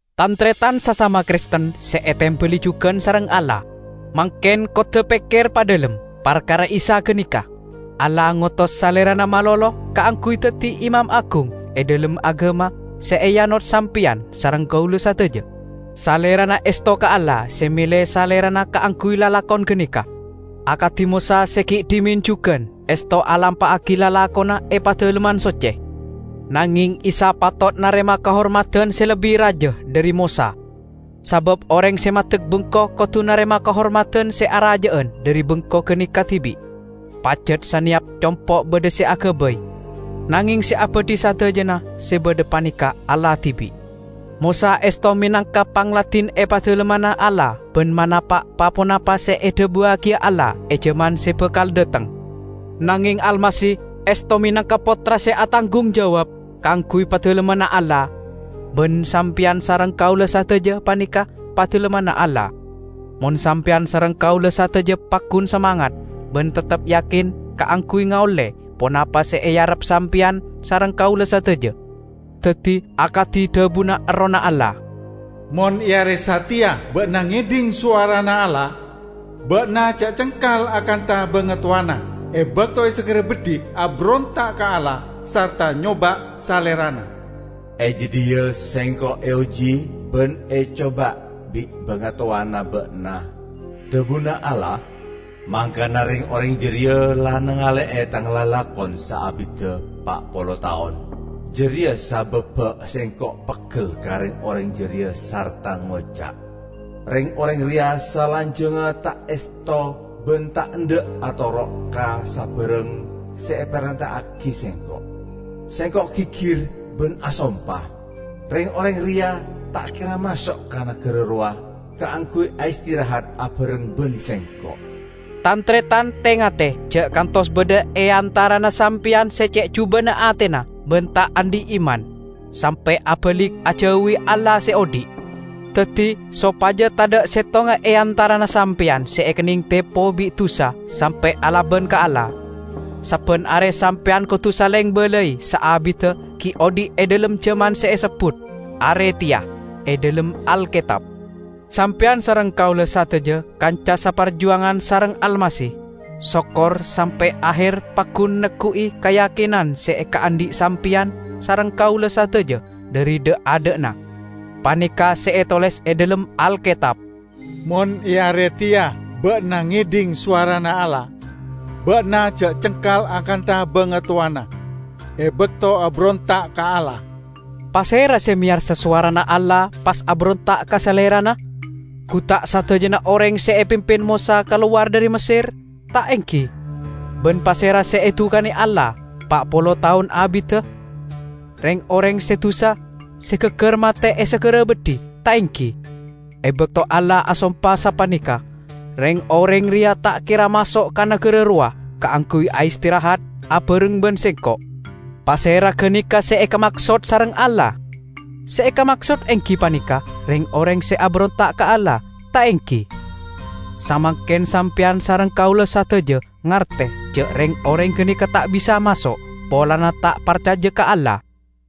Tan-taretan sasama Kristen se etembali jugan sareng Allah! Mangken kodda' pekker padhalem parkara Isa ganeka! Allah ngotos Salerana malolo kaangguy daddi Imam Agung e dhalem agama se eanot sampeyan sareng kaula sadaja. Salerana esto ka Allah se mele Salerana kaangguy lalakon ganeka, akadi Mosa se gi' dhimen jugan esto alampa'agi lalakonna e Padalemman Socce. Nangeng Isa patot narema kahormadan se lebbi raja dhari Mosa. Sabab oreng se maddek bengko kodu narema kahormadan se araja'an dhari bengko ganeka dibi'. Pajat saneyap compo' badha se agabay, nangeng se abadhi sadajana se badha paneka Allah dibi'. Mosa esto menangka pangladin e padalemmanna Allah ban manapa' pa-ponapa se edhabuwagiya Allah e jaman se bakal dhateng. Nangeng Almasih esto menangka Pottra se atanggung jawab kaangguy padalemmanna Allah. Ban sampeyan sareng kaula sadaja paneka padalemmanna Allah, mon sampeyan sareng kaula sadaja paggun samangat ban teptep yakin kaangguy ngaolle ponapa se earep sampeyan sareng kaula sadaja. Daddi, akadi dhabuna Errohna Allah, "Mon e are sateya ba'na ngedhing sowarana Allah, ba'na ja' cengkal akantha bangatowana, e bakto e sagara beddhi aberonta' ka Allah sarta nyoba' Salerana. 'E jadhiya Sengko' eoji ban ecoba bi' bangatowana ba'na,' dhabuna Allah, 'mangkana reng-oreng jareya la nangale'e Tang lalakon saabidda pa' polo taon.' Jareya sababba Sengko' peggel ka reng-oreng jareya sarta ngoca', 'Reng-oreng reya salanjangnga ta' esto ban ta' endha' atoro' ka sabarang se eparenta'agi Sengko'.' Sengko' gigir ban asompa, 'Reng-oreng reya ta' kera maso' ka nagara rowa, kaangguy aistirahat abareng ban Sengko'.' " Tan-taretan, te-ngate ja' kantos badha e antarana sampeyan se ce' juba'na atena ban ta' andhi' iman, sampe' abalik ajauwi Allah se odhi'! Daddi, sopaja tadha' settonga e antarana sampeyan se ekenneng tepo bi' dusa sampe' alaban ka Allah, sabban are sampeyan kodu saleng balai saabidda gi' odhi' e dhalem jaman se esebbut "Are Teya" e dhalem Alketab. Sampeyan sareng kaula sadaja kanca saparjuangan sareng Almasih, sokor sampe' aher paggun neggu'i kayakinan se ekaandhi' sampeyan sareng kaula sadaja dhari dha'-adha'na. Paneka' se etoles e dhalem Alketab, "Mon e are teya ba'na ngedhing sowarana Allah, ba'na ja' cengkal akantha bangatowana, e bakto aberonta' ka Allah." Pasera se meyarsa sowarana Allah pas aberonta' ka Salerana? Gu ta' sadajana oreng se epimpin Mosa kalowar dhari Messer, ta' enggi? Ban pasera se edukane Allah pa' polo taon abidda? Reng-oreng se dusa, se gaggar mate e sagara beddhi, ta' enggi? E bakto Allah asompa sapaneka, "Reng-oreng reya ta' kera maso' ka nagara rowa, kaangguy aistirahat abareng ban Sengko'" -- pasera ganeka se ekamaksod sareng Allah? Se ekamaksod enggi paneka reng-oreng se aberonta' ka Allah, ta' enggi? Samangken sampeyan sareng kaula sadaja ngarte ja' reng-oreng ganeka ta' bisa maso', polana ta' parcaja ka Allah.